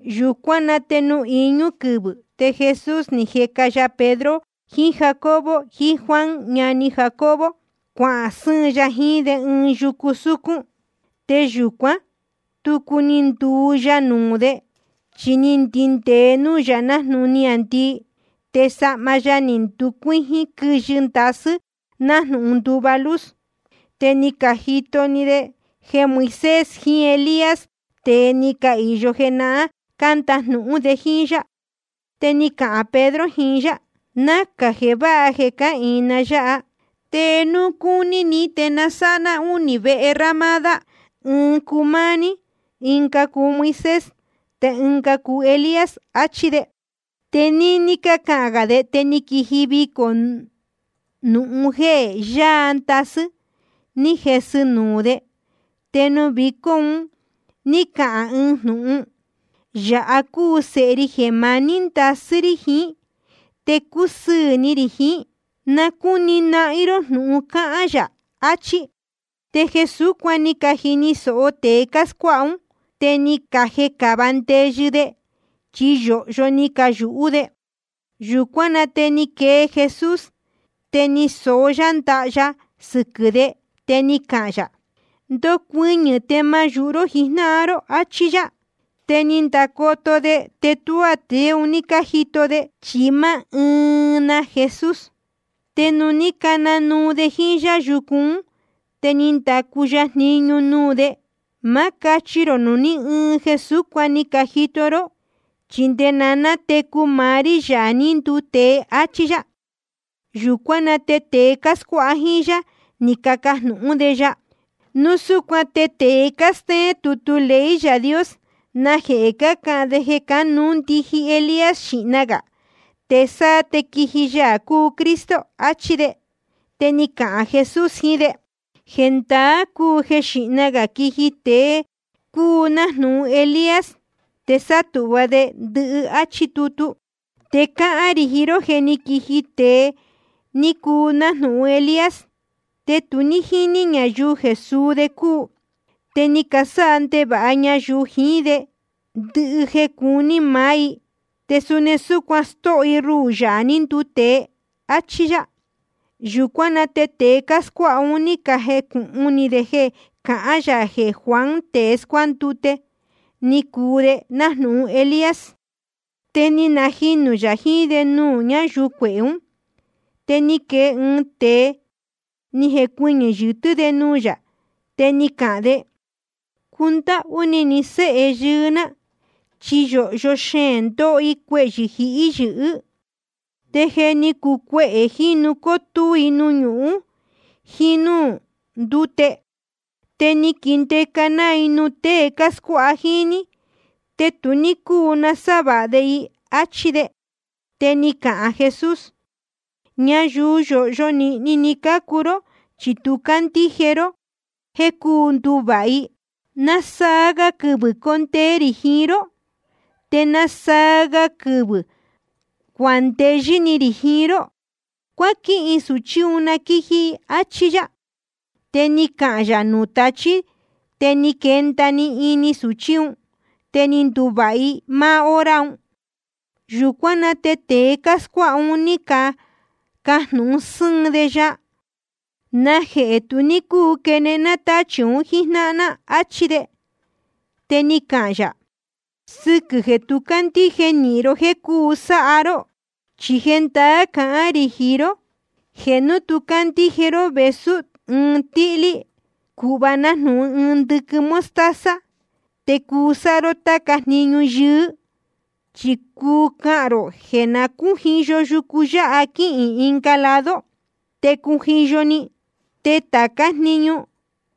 Yūcuán na te nuū iñú quɨvɨ̄ te Jesús ni jeca ya Pedro jiín Jacobo jiín Juan ñani Jacobo, cuahān sɨ́ɨn ya jiín de ɨɨn yucu súcún. Te yūcuán, tucu ni nduu ya nuū de. Chi ni ndindēe núū yā nájnūhun niāndii. Te sahma ya ni nducuíjín quɨyɨ ndasɨ́, nájnūhun nduva luz. Te ni cajito‑ni de jeē Moisés jiín Elías, tēe ni cahīyo jenahán, cándajnūhún de jíín yá. Te ni cahān Pedro jiín yá: Nacā jeē váha jeē cáhīin ná yáha. Te núu cúní ni te na sáha ná únī vehe ramada, ɨɨn cuu máá ní, ɨnga cuu Moisés, te ɨnga cuu Elías, achí de. Te níní cáhán gā de, te ni quiji vicō nūhun jéē yaa ndasɨ́, ni jesɨ‑ni nuū de. Te nuū vicó un ní cahān ɨɨn jnūhun: Yāha cúu Sēhe ri jeē maní ndasɨ́ rí jiín, te cúsɨɨ̄ ni rī jiín. Na cúni nahín ró jnūhun cáhán yā. Achí. Te jeē súcuan ni cajini sōho tēe cáscuáha ún, te ni cajecava ndeyɨ de, chi yōhyo ni cayūhú de. Yūcuán na te ni quee Jesús, te ni soó yá ndaha ya sɨquɨ̄ de. Te ni cahān yā: Ndocuɨñɨ̄, te ma yūhu ró jijnáhan ró, áchí yá. Te ni candacoto de, te tuá tēe un ní cájito de, chi máá ɨɨn na Jesús. Te ni cananuu de jíín yá yucu ún. Te ni ndacu ya jniñu nuū de: Ma cáchi rō nuū ní ɨɨn jeē súcuan ni cajito ró, chi nde na nátecu maá rí, Yaā ní nduu tēe, áchí yá. Yūcuán na te tēe cáscuáha jíín yá, ni cacajnūhún de ya: Núu súcuan te tēe cástéén tutu ley Yaā Dios, ¿najehē cácahān de jeē cánuú ndiji Elías xīhna gā, te sáá te quiji Yaā cúu Cristo? achí de. Te ni cahān Jesús jiín de: Jendaá cúu jeē xíhna gā quiji ɨɨn tēe cuu nájnūhun Elías, te sátūhva de ndɨhɨ, áchí tutu. Te cáhán rī jiín ró jeē jé ni quiji tēe ni cuu nájnūhun Elías, te tu ní jíní ñayuu jeē suu de cúu. Te ni casáha ndevāha ñayuu jiín de ndɨhɨ jeē ní cacuu ni maá i. Te suni súcuan stóho i ruhū, Yaā ní nduu tēe. Achí yá. Yūcuán na te tēe cáscuáha un, ní cajecūhun ni de jeē cahán yā jeē Juan tēe scuándute, ni cuu de nájnūhun Elías. Te ni najinū yā jiín de nuū ñáyuu cuehē ún. Te ni quee ɨɨn tēe, ni jecuɨñɨ̄ yɨtɨ́ de nuū yā, te ni cahān de: Cundáhú ni ni séhe yɨɨ́ ná, chi yōhyo xeēn ndóho i cuehyɨ̄ jíhí yɨ̄hɨ́. Te je ni cuu cuehē jínu cótúú i nuū ñuhún jíín núū ndúte. Te ni quindeca ná i nuū tée cáscuáha jíín ní, te tu ní cúu sávāha de i, áchí de. Te ni cahān Jesús: Ñayuu yōhyo nīhni ni cácuu ró chi tu cácandíje ró jéē cuu nduvāha i. ¿Nasaa ga quɨvɨ̄ condee rī jiín ró? ¿Te nasaa ga quɨvɨ̄ cuandeyɨ́ ni rī jiín ró? Cuáquihin sūchí un na quíji i, áchí yá. Te ni cahān yā nuū tachí, te ni quenda‑ni ini sūchí un. Te ni nduvāha‑ni i máá hora un. Yūcuán na te tēe cáscuáha un, ní cacajnūhun sɨ́ɨn de ya: ¿Najehē tu ní cúu quenehen ná tachī un jíjnáhan ná? achí de. Te ni cahān yā: Sɨquɨ̄ jeē tu cácandíje nīhin ró jéē cuu sáha ró. Chi jendaá cahán rī jiín ró, jeē núu candíje ró vēsú ɨɨn tíhlí‑ni, cūhva nájnūhun ɨɨn ndɨquɨn mostaza, te cuu sáha ró táca‑ni jniñu yɨɨ́. Chi cuu cahān rō jeē na cújiyo yucu yáha quihīn ɨnga lado, te cujiyo‑ni. Te tācá‑ni jniñu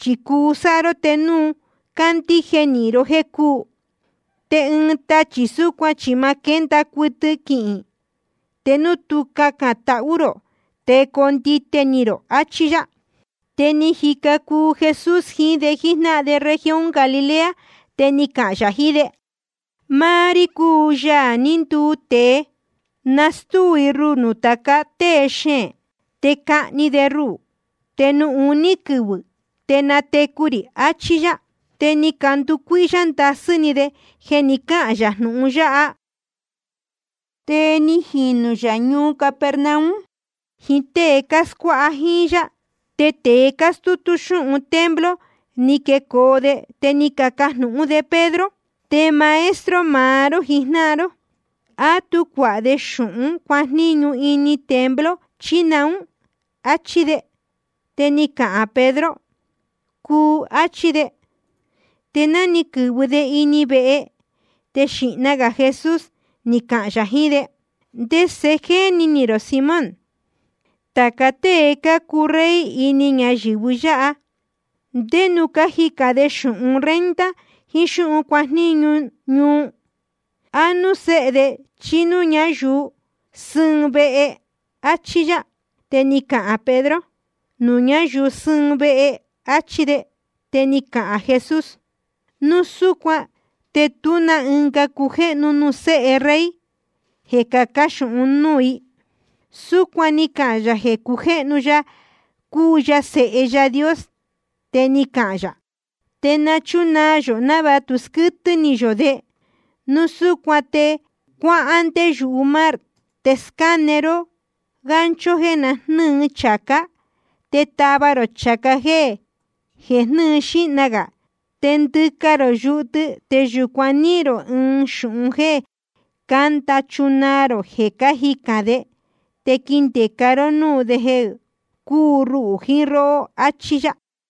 chi cuu sáha ró, te núu candíje nīhin ró jéē cúu. Te ɨɨn tachī súcuan chi ma quénda cuɨtɨ quihīn, te núu tu cacān tahú rō te coo ndite ni rō. Achí yá. Te jíca cuu Jesús jiín de jíjnáhan de región Galilea, te ni cahān yā jiín de: Máá rí, Yaā ní nduu tēe, nastúu i ruhū nuū tāca tée xeēn. Te cahni de ruhū, te nuū uní quɨvɨ̄ te natecu rī, achí yá. Te ni canducuíhyá ndasɨ́ ni de jeē ni cáhān yā jnūhun yáha. Te ni jinū yā ñuu Capernaum jiín tée cáscuáha jíín yá. Te tēe cástútú xúhun templo ni quecoo de, te ni cacajnūhún de Pedro: Te maestro maá ró jijnáhan ró, ¿á tú cuāha de xūhún cuajníñu ini templo, chí naún? áchí de. Te ni cahān Pedro: Cuu, áchí de. Te ná ni quɨ̄vɨ de ini vehe, te xīhna gā Jesús ni cahān yā jiín de: ¿Ndese jéni ni rō, Simón? Tāca tée cácuu rey ini ñayɨ̄vɨ yáha, ¿ndé núū cájicān de xūhun renta jiín xúhun cuajníñu ñuu? ¿A núū séhe de chí núū ñáyuu sɨ́ɨn vehe? áchí yá. Te ni cahān Pedro: Nuū ñáyuu sɨ́ɨn vehe, áchí de. Te ni cahān Jesús: Núu súcuan te tú na ɨnga cujéhnu nuū séhe rey jeē cacán xūhún un núū i. Súcuan ni cahān yā jeē cujéhnu ya cúu ya Sēhe Yaā Dios. Te ni cahān yā: Te na chúnaa yō, návāha tu squɨ́tɨ́ ni yō de. Núu súcuan te cuáhán ndé yumar, te scáne ró gancho jeē jnɨ́ɨ chācá, te tava rō chācá jéē jnɨ́ɨ xīhna gā. Te ndɨca rō yuhu tɨ, te yūcuan níhīn rō ɨɨn xūhun jéē cánda chunaa rō jeē cájicān de. Te quindēca ró núū de jeē cúu ruhū jiín róhó. Achí yá.